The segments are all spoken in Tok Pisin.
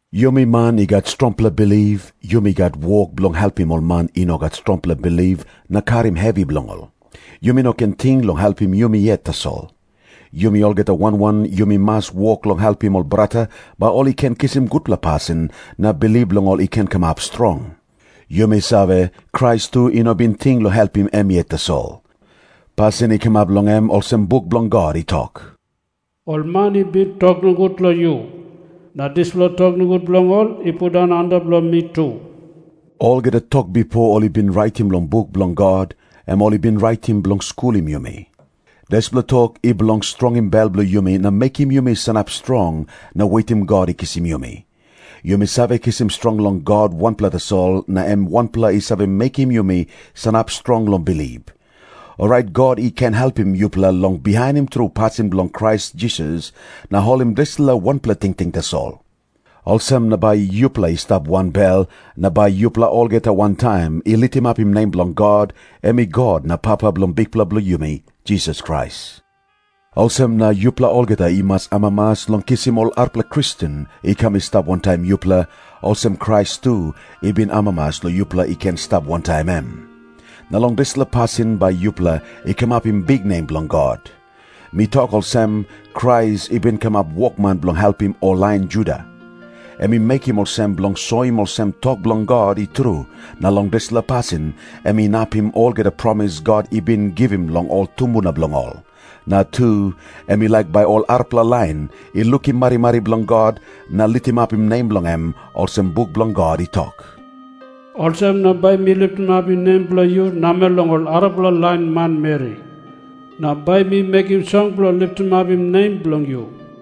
Yumi man i gat strongpela bilip, yumi gat wok bilong helpim ol man i no gat strongpela bilip na karim hevi bilong ol. Yumi no ken ting long helpim yumi yet tasol. Yumi olgeta wan wan yumi mas wok long helpim ol brata, bai ol i ken kisim gutpela pasin na bilip bilong ol i ken kamap strong. Yumi save, Krais tu i no bin ting long helpim em yet tasol. Pasin i kamap long em olsem buk bilong God i tok, “Ol man i bin tok nogut long yu, na dispela tok nogut bilong ol i pundaun antap long mi tu.” Olgeta tok bipo ol i bin raitim long buk bilong God, em ol i bin raitim bilong skulim yumi. Dispela tok i bilong strongim bel bilong yumi na mekim yumi sanap strong na wetim God i kisim yumi. Yumi save kisim strong long God wanpela tasol na em wanpela i save mekim yumi sanap strong long bilip. Orait God i ken helpim yupela long bihainim tru pasin bilong Krais Jisas na holim dispela wanpela tingting tasol. Olsem na bai yupela i stap wanbel, na bai yupela olgeta wantaim i litimapim nem bilong God, em i God na Papa bilong Bikpela bilong yumi Jisas Krais. Olsem na yupela olgeta i mas amamas long kisim ol arapela Kristen i kam i stap wantaim yupela, olsem Krais tu i bin amamas long yupela i ken i stap wantaim em. Na long dispela pasin bai yupela i kamapim biknem bilong God. Mi tok olsem, Krais i bin kamap wokman bilong helpim ol lain Juda. Em i mekim olsem bilong soim olsem tok bilong God i tru, na long dispela pasin em inapim olgeta promis God i bin givim long ol tumbuna bilong ol. Na tu, em i laik bai ol arapela lain i lukim marimari bilong God na litimapim nem bilong em, olsem buk bilong God i tok, “Olsem na bai mi litimapim nem bilong yu namel long ol arapela lain manmeri. Na bai mi mekim song bilong litimapim nem bilong yu.”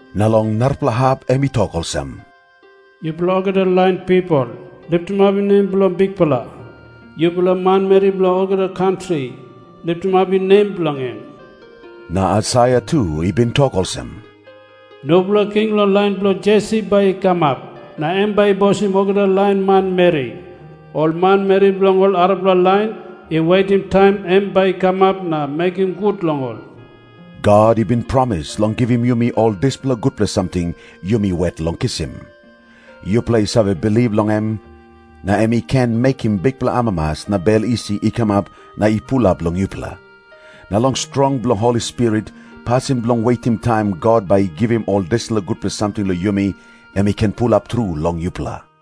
Na long narapela hap em i tok olsem, “Yupela olgeta lain pipel, litimapim nem bilong Bikpela. Yupela manmeri bilong olgeta kantri, litimapim nem bilong en.” Na Aisaia tu i bin tok olsem, “Nupela king long lain bilong Jesi bai i kamap, na em bai i bosim olgeta lain manmeri. Ol manmeri bilong ol arapela lain i wetim taim em bai i kamap na mekim gut long ol.” God i bin promis long givim yumi ol dispela gutpela samting yumi wet long kisim. Yupela i save bilip long em, na em i ken mekim bikpela amamas na bel isi i kamap na i pulap long yupela. Na long strong bilong Holi Spirit, pasin bilong wetim taim God bai i givim ol dispela gutpela samting long yumi, em i ken pulap tru long yupela.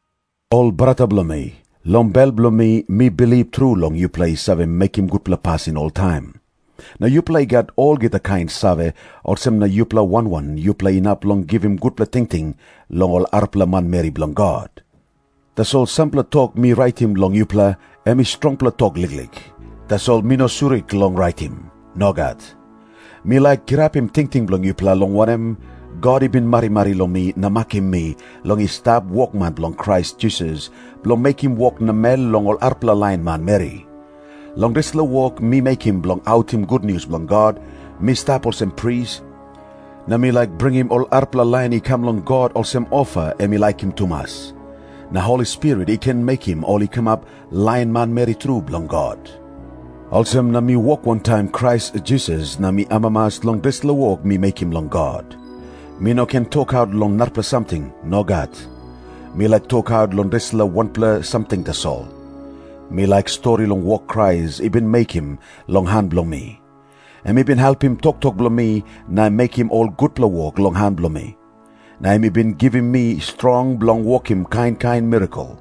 Ol brata bilong mi, long bel bilong mi mi bilip tru long yupela i save mekim gutpela pasin oltaim. Na yupela i gat olgeta kain save, olsem na yupela wan wan yupela inap long givim gutpela tingting long ol arapela manmeri bilong God. Tasol sampela tok mi raitim long yupela, em i strongpela tok liklik. Tasol mi no surik long raitim. Nogat. Mi laik kirapim tingting bilong yupela, long wanem, God i bin marimari long mi na makim mi long i stap wokman bilong Krais Jisas, bilong mekim wok namel long ol arapela lain manmeri. Long dispela wok mi mekim bilong autim gutnius bilong God, mi stap olsem pris, na mi laik bringim ol arapela lain i kam long God olsem ofa em i laikim tumas. Na Holi Spirit i ken mekim ol i kamap lain manmeri tru bilong God. Olsem na mi wok wantaim Krais Jisas na mi amamas long dispela wok mi mekim long God. Mi no ken tokaut long narapela samting. Nogat. Mi laik tokaut long dispela wanpela samting tasol. Mi laik stori long wok Krais i bin mekim long han bilong mi. Em i bin helpim toktok bilong mi na mekim ol gutpela wok long han bilong mi. Na em i bin givim mi strong bilong wokim kain kain mirakel.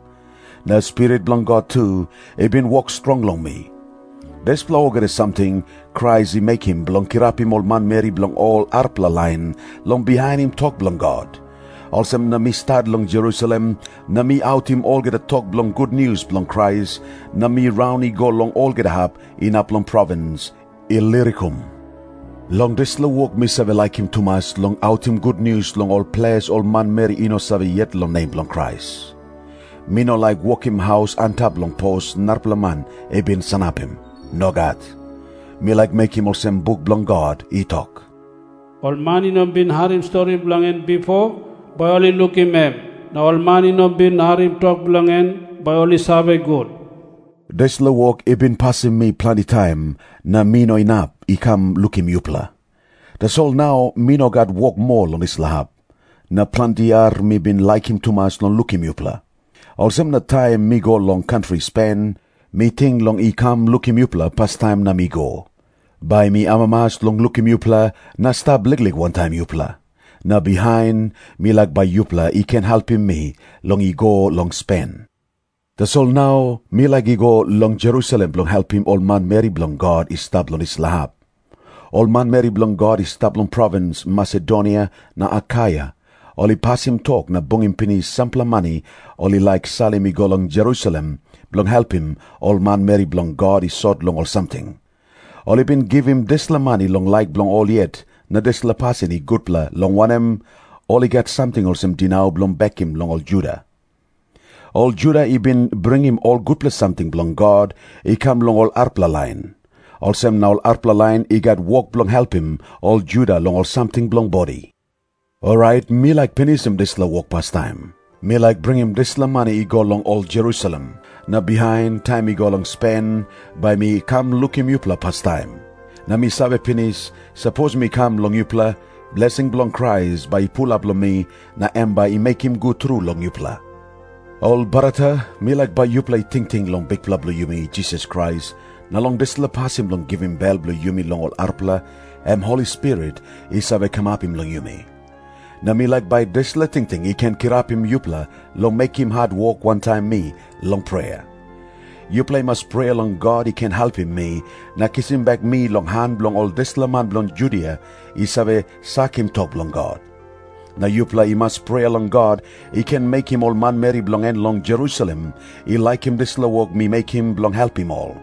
Na Spirit bilong God tu i bin wok strong long mi. Dispela olgeta samting Krais i mekim bilong kirapim ol manmeri bilong ol arapela lain long bihainim tok bilong God. Olsem na mi stat long Jerusalem na mi autim olgeta tok bilong gutnius bilong Krais, na mi raun i go long olgeta hap inap long provins Ilirikum. Long dispela wok mi save laikim tumas long autim gutnius long ol ples ol manmeri i no save yet long nem bilong Krais. Mi no laik wokim haus antap long pos narapela man i bin sanapim. Nogat. Mi laik mekim olsem buk bilong God i tok, “Ol man i no bin harim stori long en bipo, bai ol i lukim em. Na ol man i no bin harim tok bilong en, bai ol i save gut.” Dispela wok i bin pasim mi planti taim, na mi no inap i kam lukim yupela. Tasol nau mi no gat wok moa long dispela hap. Na planti yia mi bin laikim tumas long lukim yupela. Olsem na taim mi go long kantri Spen, mi ting long i kam lukim yupela pastaim na mi go. Bai mi amamas long lukim yupela na stap liklik wantaim yupela. Na bihain mi laik bai yupela i ken helpim mi long i go long Spen. Tasol nau mi laik i go long Jerusalem bilong helpim ol manmeri bilong God i stap long dispela hap. Ol manmeri bilong God i stap long provins Masedonia na Akaia, ol i pasim tok na bungim pinis sampela mani ol i laik salim i go long Jerusalem, bilong helpim ol manmeri bilong God i sot long ol samting. Ol i bin givim dispela mani long laik bilong ol yet, na dispela pasin i gutpela, long wanem, ol i gat samting olsem dinau bilong bekim long ol Juda. Ol Juda i bin bringim ol gutpela samting bilong God i kam long ol arapela lain. Olsem na ol arapela lain i gat wok bilong helpim ol Juda long ol samting bilong bodi. Orait mi laik pinisim dispela wok pastaim. Mi laik bringim dispela mani i go long ol Jerusalem, na bihain, taim mi go long Spen, bai mi kam lukim yupela pastaim. Na mi save pinis, sapos mi kam long yupela, blesing bilong Krais bai i pulap long mi, na em bai i mekim gut tru long yupela. Ol brata, mi laik bai yupela i tingting long Bikpela bilong yumi Jisas Krais, na long dispela pasin bilong givim bel bilong yumi long ol arapela, em Holi Spirit i save kamapim long yumi. Na mi laik bai dispela tingting i ken kirapim yupela long mekim hatwok wantaim mi long prea. Yupela i mas prea long God i ken helpim mi na kisim bek mi long han bilong ol dispela man bilong Judia i save sakim tok bilong God. Na yupela i mas prea long God i ken mekim ol manmeri bilong en long Jerusalem i laikim dispela wok mi mekim bilong helpim ol.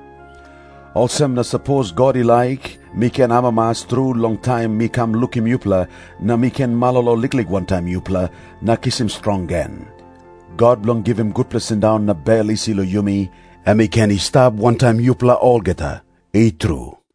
Olsem na sapos God i laik, mi ken amamas tru long taim mi kam lukim yupela, na mi ken malolo liklik wantaim yupela na kisim strong gen. God bilong givim gutpela sindaun na bel isi long yumi, em i ken i stap wantaim yupela olgeta. I tru.